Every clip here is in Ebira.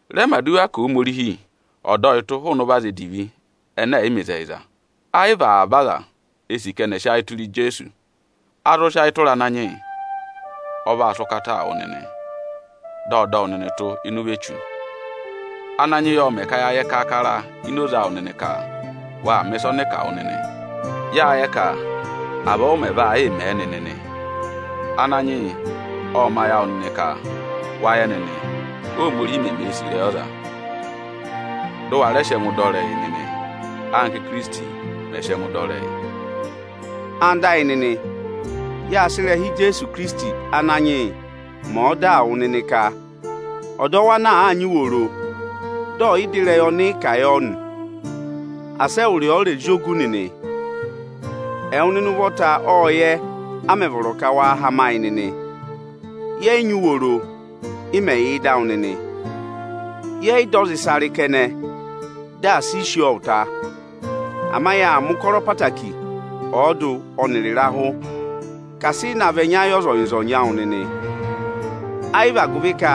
Rẹ mẹ̀ aduwa ka Ohomorihi ọ̀ dọ yị tụ́ ịnị ụvọ aza edivi ẹnẹ ẹ̀ yị mẹ ịzẹyịza! Ẹ yị vị avaba aza e sì ka ẹnị ẹ̀ sị ayị tụra Ijeesu. A zụ sị ayị tụra Ananyị yị. Ọ vaa sị ụkataa wụ nịnị, dị ọ dọ wụ nịnị tụ́ ịnị ụvọ Echu. Ananyị yị ộ mẹ̀ ka ya yẹ kaakara ini oze awụ nịnị ka waa mẹ̀ ịsa ọnị ị kà wụ nịnị. Yáa yẹ ka avọọ ụ mẹ̀ vaa yịị mẹ nịnị nị. Ananyị yị ọ̀ mẹ ayị awụ nịnị ka wa yẹ, Óhomorihi meme sì ịrẹyị ọza, dụ wa rẹẹ sị ẹngụụ dọ ịrẹyị nịnị, anka Íkirisiti mẹ̀ẹ mẹ ka ọza ọ̀ sị ẹngụ dọ ịrẹyị. Ẹwụ nịnị ẹyịnyara amị, yáa sị ịrẹha Ijeesu Ikirisiti Ananyị yị mẹ ọdaa wụ nịnị ka: ọdọwụ ana àa nyị uworo dị ọ̀ yị dọ ịrẹyị ọnị ị kà yọ nị, asị ẹwụrị ọọ rẹ̀ zị ògù nịnị! Ẹwụ nịnị ụvọta ọ́ọ yẹ, a mẹ̀ vọrọ ka waa hama yị nịnị. Yẹ yị nyị uworo, ị mẹ̀ yà ịdị awụ nịnị. Yẹ yị dọ ọza ịsa rị kẹnẹ, dị asị i sí ọọ ụta. Ama yáa mẹ̀ ụkọrọ ẹtẹẹtẹrẹ ọọdụ ọnịrị ịrahụ ka asị ị na vị ẹnya yị ọzọnyị-ọzọnyị awụ nịnị. Ayị vị agụvị ka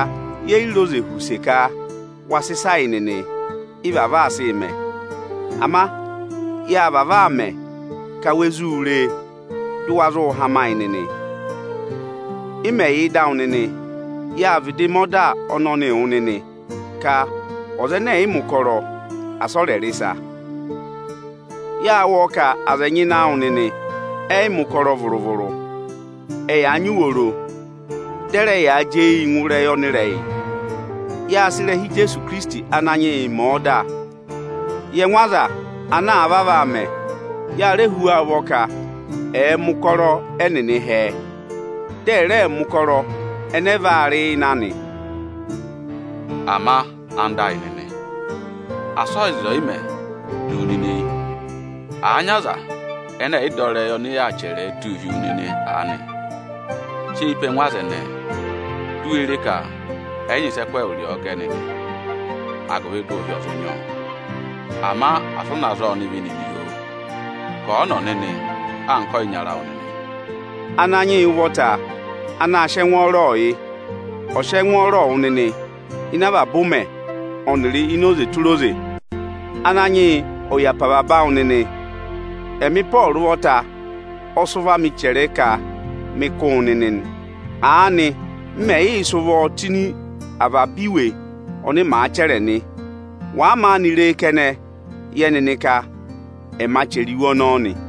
ye yi re oze họ̀ use ka waa sị ịsaa yị nịnị, ị́ vavọọ aa sịị mẹ. Ama yâ vavọọ mẹ ka wa zụ ree, dị waa hama yị nịnị. Ị mẹ̀ yà ịdị awụ nịnị, yáa vịdị mẹ ọda ọnọnịị wụ nịnị ka ọza ẹnẹ ẹ̀ yị mẹ̀ ụkọrọ, asị ọ rẹ rị ịsa. Yáa wụ́ ọọ ka aza ẹnyị ịnị awụ nịnị ẹyị mẹ̀ ụkọrọ vụrụ-vụrụ. Ẹyaa nyị uworo, dị ẹ rẹ yaa jị eyii ngụ ịrẹyị ọnịrẹyị. Yáa sị ịrẹha Ijeesu Ikirisiti Ananyị yị mẹ ọda yị ẹngụ aza ana vavọọ aa mẹ, ya rẹ hú wa ụvọ ka ẹ̀ẹ mẹ̀ ụkọrọ ẹnịnị hẹẹ, dị ẹ̀ rẹẹ mẹ̀ ụkọrọ ẹnẹ ẹ vaa rị ịnị anị. Ama anda ayị nịnị, asị ọyịza ọyịmẹ̀ du wu nịnị eyi! Àa nyị aza ẹnẹ ẹ̀yị dọ ịrẹyị ọnị yaa chẹrẹ ẹ tụ́ụ hi wu nịnị aanị, sị eyi pe ẹngụ aza ẹnẹẹ, di u we re ka ẹ yị nyị ịsị ẹ kụ́ ẹwụrị ọọ gẹ nịnị, agụvị dị ụhị ọ̀ zụ nyị ọọ. Ama asị ụ na zaa ọnịvị nịnị, oo! Kàa ọnọ nịnị anka ọyịnyara awụ nịnị! Ananyị yị ụvọta anaā sịị ẹngwọọrọọ yị, ọ̀ sị ẹngwọọrọ wụ nịnị ịnị avaba ụmẹ ọnịrị ini oze tụra oze! Ananyị yị ọ̀ yà pe avaba awụ nịnị! Ẹmị Ịpọọrụ ụvọta ọ sị ụvọ amị chẹrẹ ẹ ka mị kụ́ wụ nịnị nị. Aanị m mẹ̀ yị sị ụvọọ tụ́ ịnị avaba iwe ọnị màa chẹrẹ nị. Wàa maanị ree kẹnẹ, yẹ nịnị ka ẹma chẹrẹ iwe ọnọọ nị!